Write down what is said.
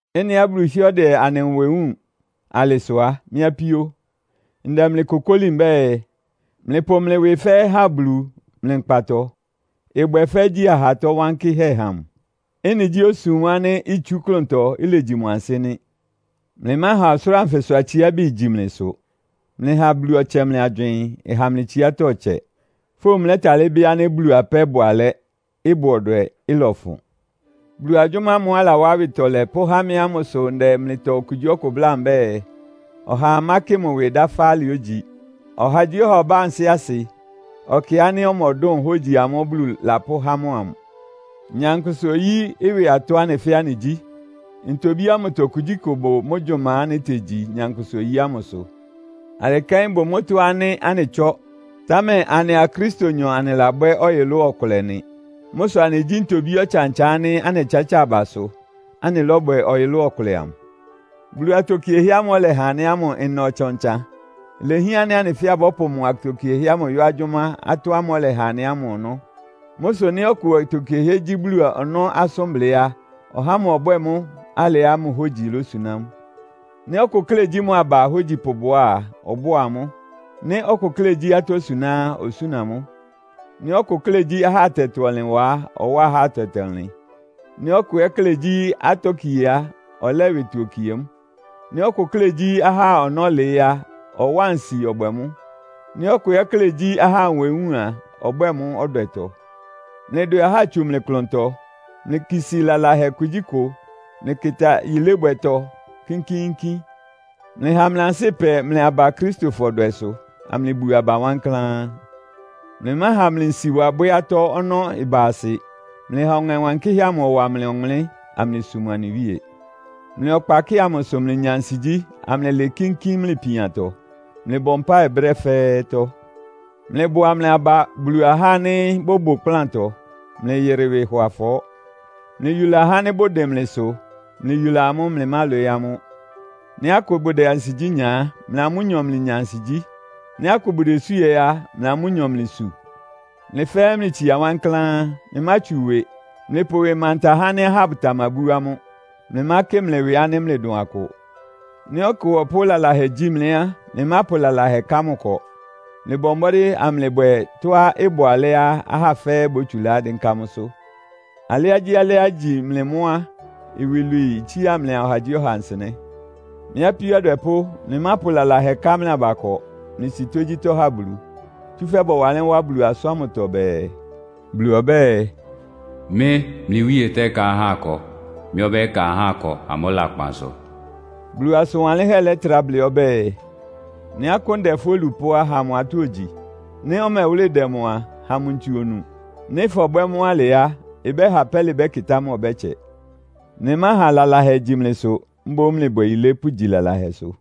Ɩ́nɩá Bulu hɩ́ɛ́ ɔdɛ anɩ nwɛ wúun alɩ sʋ á, mɩ́ apíó, ndɛ mlɩ kokóli mbɛ́ɛ, mlɩpʋ mlɩ ɩwɩ fɛ́ɛ́ ha Bulu mlɩ nkpatɔ. Ɩbwɛ́ɛ fɛ́ igyí ahatɔ́ wankɩ́hɛ́ ha mʋ. Ɩ́nɩ gyí osum ánɩ́ itsú klʋntɔ, ilegyi mʋ ansɩ́ nɩ́. Mlɩmáha ɔsʋlʋ́ʋ anfɩsʋ atsiábi igyi mlɩsʋ. Mlɩha Bulu ɔtsɛ mlɩ agywɩɩn, ɩha mlɩ tsiátɔ́ ɩtsɛ. Fówun mlɛ́talɩ́ bɩ́ ánɩ́ Bulu apɛ́ bʋ alɛ́, ɩbʋ ɔdwɛ, ɩlɔfʋn. Bulu agyʋ́má ámʋ́ʋ́ alawá awɩtɔlɛ pʋ́há mɩ́ ámʋsʋ ndɛ mlɩtɔ okugyíɔkʋ bláa mbɛ́ɛ, ɔhaa mákɩ mʋ ɩwɩ dáfá alɩá ogyi. Ɔhagyíɔha ɔbá ansɩ́ asɩ, ɔkɩ ánɩ́ ɔmɔdʋn hógyi amʋ́ʋ́ Bulu lapʋ́há mʋ amʋ. Nyankpʋsa-oyí ɩwɩ atɔ́ anɩ fɛ́ɛ́ anɩgyí. Ntobí ámʋtɔ kugyíkʋ bʋ mʋ́ gyʋma ánɩ́ itegyi nyankpʋsa-oyí ámʋsʋ. Alɩ kɛ́n ɩbʋ mʋ́tɔ́ ánɩ́ anɩtsɔ́, támɛ anɩa Kristonyɔ anɩlabwɛ́ ɔyʋlʋ́ʋ ɔkʋlɛ nɩ. Mʋ́ sʋ anɩgyí ntobí ɔtsan-ɔtsan ánɩ́ anɩtsátsáa abasʋ, anɩlɔ́bwɛ ɔyʋlʋ́ʋ ɔkʋlɛ amʋ. Bulu atokiehɛ́ ámʋ́ʋ́ ɔlɛha anɩ ámʋ ɩna ɔtsan-ɔtsan. Ilehián ánɩ́ anɩ fɛ́ɛ́ abɔ́pʋ mʋ atokiehɛ́ ámʋ yɔ́ agyʋ́má atɔ́ ámʋ́ʋ́ ɔlɛha anɩ ámʋ ɔnɔ́. Mʋ́ sʋ nɩ́ ɔkʋ atokiehɛ́ gyí Bulu ɔnɔ́ asʋ́nblɩ́ á, ɔhá ámʋ ɔbwɛ́ɛ mʋ́ alɩá mʋ hógyi losuná mʋ. Nɩ́ ɔkʋ klɛ́ gyí mʋ aba ahógyipʋ bʋá a, ɔbʋ́a amʋ́. Nɩ́ ɔkʋ klɛ́ gyí atɔ́ suná á, osúna mʋ́. Nɩ́ ɔkʋ klɛ́ gyí ahá atɛtɔ-ɔnlɩn wa á, ɔwá ahá atɛtɔ-ɔnlɩn. Nɩ́ ɔkʋ ɛ́ klɛ́ gyí atɔ́ kie á, ɔlɛ́ ɩwɩtɔ okie mʋ́. Nɩ́ ɔkʋ klɛ́ gyí ahá ɔnɔ́ lɩɩ́ á, ɔwáa nsi ɔbwɛ mʋ́. Nɩ́ ɔkʋ klɛ́ ɛ́ gyí ahá nwɛ wúun a, ɔbwɛ́ɛ mʋ́ ɔdwɛtɔ. Mlɩdwɛ ahá tsu mlɩ klʋntɔ. Mlɩkisi lalahɛ kugyíkʋ. Mlɩkɩta yilébwɛtɔ kínkíínkín. Mlɩha mlɩ ansɩ́ ɩpɛ mlɩ aba Akristofɔ dwɛsʋ, amlɩbu aba wankláán. Mlɩmáha mlɩ nsiwa bwɛ́ atɔ́ ɔnɔ́ ɩba asɩ. Mlɩha Ɔŋɛ Wankɩ́hɛ́ amʋ ɔwa mlɩ ɔwʋnlɩ́n, amlɩsum anɩ Wíe. Mlɩ ɔkpakɩ́ɩ amʋ sʋ mlɩnya ansigyí, amlɩlɩɩ kínkín mlɩ ipiantɔ. Mlɩbɔ mpáɩ brɛ́ fɛ́ɛ́tɔ́. Mlɩbʋa mlɩ aba Bulu ahá ánɩ́ bʋbʋ ɩkplántɔ. Mlɩyɩrɩ ɩwɩ hɔ afɔɔ́. Mlɩyula ahá ánɩ́ bʋdɩn mlɩsʋ. Mlɩyula amʋ́, mlɩmálwɩɩ́ amʋ́. Nɩ́ akʋ bʋdɛ ansigyí nya á, mlɩa amʋ́nyɔ mlɩnya ansigyí. Nɩ́ akʋ bʋdesú ɛ́ á, mlɩa amʋ́nyɔ mlɩsu. Mlɩ fɛ́ɛ́ mlɩtsia wankláán. Mlɩmátsu ɩwɩ. Mlɩpʋ ɩwɩ manta ahá ánɩ́ ahá bʋtamabú amʋ́. Mlɩmákɩ mlɩ ɩwɩ ánɩ́ mlɩdʋn akʋ. Nɩ́ ɔkʋ ɔpʋ́ lalahɛ gyi mlɩ á, mlɩmápʋ lalahɛ ká mʋ ɩkɔ. Mlɩbɔ mbɔ́dɩ́ amlɩbwɛ tɔ́á ɩbʋ alɛ́á ahá fɛ́ɛ́ bótsulá dɩ́nká mʋ́sʋ́. Alɩágyíalɩ́á igyi mlɩ mʋ́ á, iwilwii itsía mlɩa ɔhagyíɔha nsɩnɛ́. Mɩ́ apíó adwɛpʋ́, mlɩmápʋ lalahɛ ká mlɩ aba ɩkɔ. Mlɩsi tógyítɔ́ ha Bulu. Tsúfɛ́ bɔwanlɩ́n wá Bulu asʋ́n ámʋtɔ bɛɛ, “Bulu ɔbɛ́ɛ, ‘Mɩ́, mlɩ Wíe tɛ́ká ɩkɔ. Mɩ́ ɔbɛ́ka ahá akɔ amʋ́ lakpan sʋ.’” Bulu asʋn wanlɩ́nhɛ́ lɛ́trá blɩ́ ɔbɛ́ɛ, “Nɩ́ akʋ́n dɛ fʋ́ olupʋ́ á, ha mʋ atɔ́ ogyi. Nɩ́ ɔmɛwʋ́lɩ dɛ mʋ a, ha mʋ ntsu onu. Nɩ́ fɔbwɛ́ mʋ́ alɩ á, ɩbɛ́ha pɛ́lɩ bɛ́kɩtá mʋ ɔbɛ́tsɛ.” Mlɩmáha lalahɛ igyi mlɩsʋ, mboún mlɩbwɛ yilé pʋ́gyi lalahɛsʋ.